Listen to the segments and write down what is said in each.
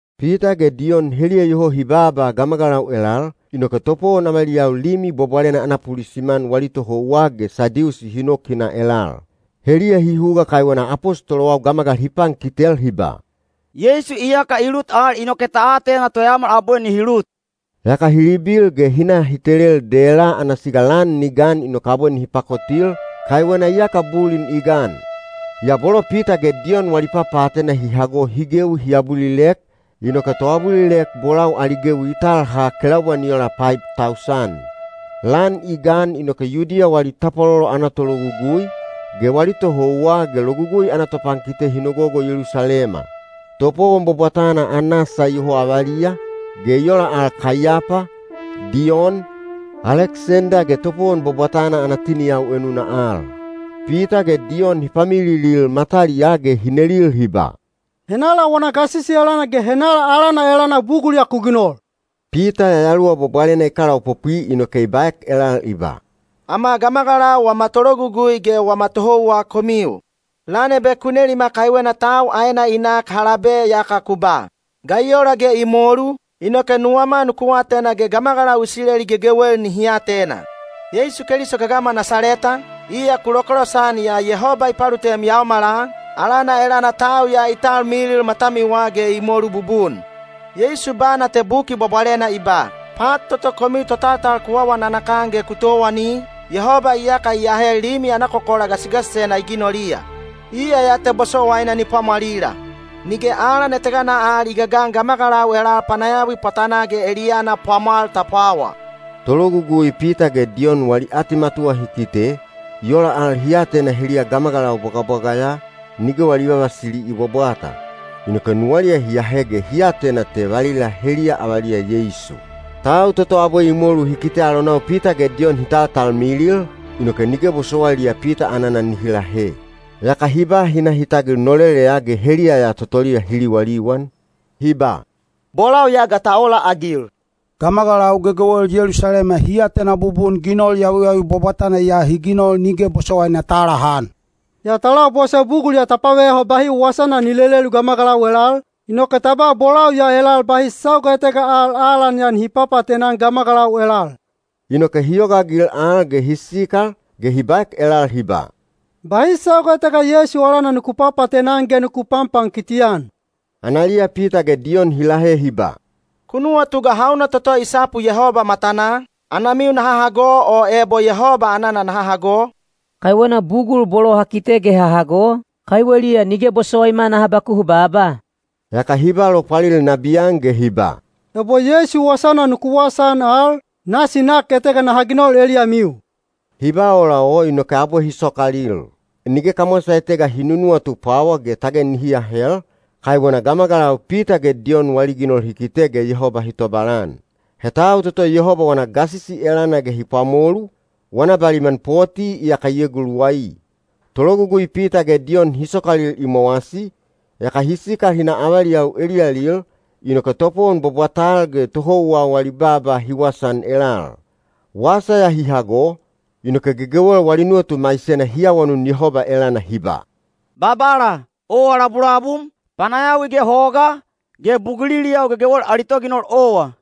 Pita ge Diyon heliya iyoho hi baaba gamagalau elal, inoke topowon avaliyau Limi Bwabwalena ana pulisiman wali tohouwa ge Sadiusi hi nok hi na elal. Heliya hi huga kaiwena apostolowau gamagalau hi pankitel hi ba, “Yeisu iyaka i lut al inoke ta atena toyaomal abwe nihi lut.” Yaka hi libil ge hi na hi telel dela ana siga lan ni gan inoke abwe nihi pakotil, kaiwena iyaka bulin i gan. Yaa bolo Pita ge Diyon wali papaatena hi hago hi gewi hi abulilek, inoke toabulilek bolau ali gewi i tal ha kelaubwa ni ola paib tausan. Lan i gan inoke Yudiya wali tapwalolo ana tologugui, ge wali tohouwa ge Logugui ana topankite hi nogogo Yelusalema. Topowon bwabwatana Anasa iyoho avaliya, ge i ola al Kaiyapa, Diyon, Aleksenda ge topowon bwabwatana ana tiniyau enuna al. Pita ge Diyon hi pamililil mataliyaa ge hi nelil hi ba, “Henala wana gasisi elana ge henala alana elana bugul ya ku ginol?” Pita Yayaluwa Bwabwalena i kalaopopwi inoke i baek elal i ba, “Ama gamagalau wama tologugui ge wama tohouwa komiu! Lan ebe ku nelima kaiwena tau aena i nak ha labe yaka ku ba, ‘Ga i ola ge i molu?’ Inoke nuwama nuku atena ge gamagalau Isileli gegewel nihi atena: Yeisu Keliso gagama Nasaleta, iya ku lokolosan yaa Yehoba i palutem yaomala, alana elana tau ya i talmilil matamiwa ge i molu bubun. Yeisu bana te Buki Bwabwalena i ba, ‘Pat toto komiu totaltal ku awa nanakan ge ku towani, Yehoba iyaka i ahe limi ana kokola gasigasisena i ginoliya.’ Iya ya te bosowaina ni pwamwalila; nige alan etega al i gagan gamagalau elal panayawi pwatanaa ge eliyana pwamwal ta pwawa.” Tologugui Pita ge Diyon wali atimatuwa hi kite, i ola al hi atena heliya gamagalau bwagabwaga ya, nige wali vavasili i bwabwata. Inoke nuwaliya hi ahe ge hi atena te valila heliya avaliya Yeisu. Tau toto abwe i molu hi kite alonau Pita ge Diyon hi taltalmilil, inoke nige bosowailiya Pita anana nihi lahe. Yaka hi ba hi na hi tagil noleleya ge heliya ya totoliya hi liwaliwan, hi ba, “Bolau ya ga ta ola-agil? Gamagalau gegewel Yelusalema hi atena bubun ginol yawiyawi bwabwatana ya hi ginol nige bosowaina ta alahan. Yaa ta labose bugul ya ta paveyaho bahi wasana ni lelelu gamagalau elal, inoke ta ba bolau ya elal bahi sauga etega al alan ya nihi papaatena-an gamagalau elal.” Inoke hi yogaagil al ge hi sikal, ge hi baek elal hi ba, “Bahi sauga etega Yeisu alana nuku papaatena-an ge nuku panpankiti-an.” Analiya Pita ge Diyon hi lahe hi ba, “Ku nuwatu ga hauna toto i sapu Yehoba matanaa, anamiu naha hago o ebo Yehoba anana naha hago? Kaiwena bugul bolo ha kite ge ha hago, kaiweliya nige bosowaima naha bakuhu baaba.” Yaka hi ba lopwalil nabiyan ge hi ba, “Ebo Yeisu wasana nuku wasaan al, nasi nak etega naha ginol eliyamiu.” Hi ba ola o inoke abwe hi sokalil. Nige kamwasa etega hi nunuwatu pwawa ge tage nihi lahel, kaiwena gamagalau Pita ge Diyon wali ginol hi kite ge Yehoba hi tobalan. He tau toto Yehoba wana gasisi elana ge hi pwamolu, wana baliman poti iyaka i eguluwai. Tologugui Pita ge Diyon hi sokalil i mowasi, yaka hi sikal hi na avaliyau eliyalil, inoke topowon bwabwatal ge tohouwa wali baaba hi wasaan elal. Wasa ya hi hago, inoke gegewel wali nuwatu maisena hi awanun Yehoba elana hi ba, “Babala, owa labulabum, panayawi ge hoga, ge buguliliyau gegewel ali toginol owa.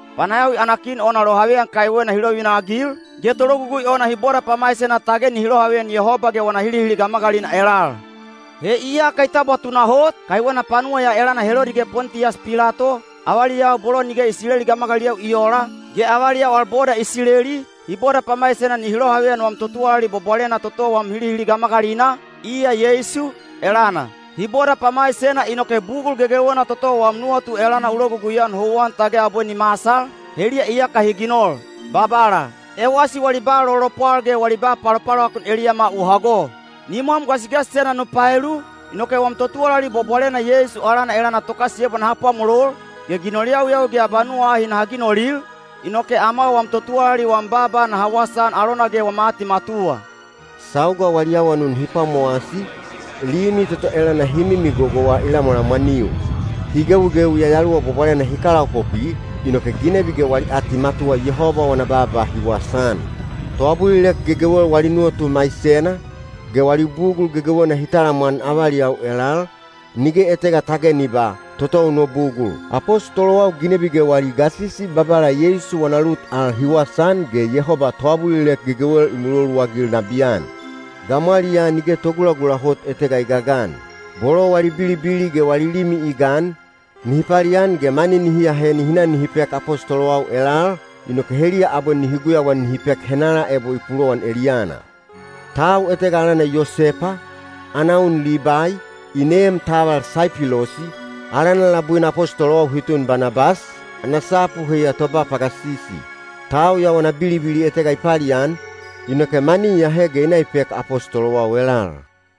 Panayawi ana kin ona lohaveyan kaiwena hi lovivina-agil, ge tologugui ona hi boda pamaisena tage nihi lohaveyan Yehoba ge wana hilihili gamagalina elal. He iyaka i tabwa tunahot, kaiwena panuwa ya elana Helodi ge Pontiyas Pilato, avaliyau bolo nige Isileli gamagaliliyau i oola, ge avaliyau al boda Isileli, hi boda pamaisena nihi lohaveyan wam totuwalali bwabwalena toto wam hilihili gamagalina, iya Yeisu, elana. Hi boda pamaisena inoke bugul gegewena toto wam nuwatu elana u logugui-an houwan tage abwe ni masal, heliya iyaka hi ginol. Babala, ewasi wali ba lolopwal ge wali ba palopalovakun eliyama u hago. Nimwam gasigasisena nu paelu, inoke wam totuwalali bwabwalena Yeisu alana elana tokasiyebwa naha pwamolol, ge ginol yawiyawi ge abanuwa ahi naha ginolil, inoke ama wam totuwalali wam baaba naha wasaan alona ge wama atimatuwa.” Sauga wali awanun hi pwamowasi, limi toto elana hi migogowa i lamwalamwaniu. Hi gewigewi Yayaluwa Bwabwalena hi kalaopopwi, inoke ginebi ge wali atimatuwa Yehoba wana baaba hi wasaan. Toabulilek gegewel wali nuwatu maisena, ge wali bugul gegewena hi talamwan avaliyau elal, nige etega tage ni ba, “Totou no bugul.” Apostolowau ginebi ge wali gasisi Babala Yeisu wana lut al hi wasaan ge Yehoba toabulilek gegewel i muloluagil nabiyan. Gamwaliyaa nige togulagula hot etega i gagan. Bolo wali bilibili ge wali limi i gan, nihi palian ge mani nihi ahe nihi na nihi pek apostolowau elal, inoke heliya abwe nihi guyauan nihi pek henala ebo i pulowan eliyana. Tau etega alana Yosepa, ana un Libai, i neem taval Saipilosi, alana labuina apostolowau hi tun Banabas, ana sapu heiya “Toba pagasisi.” Tau ya wana bilibili etega i palian, inoke mani i ahe ge i na i pek apostolowau elal.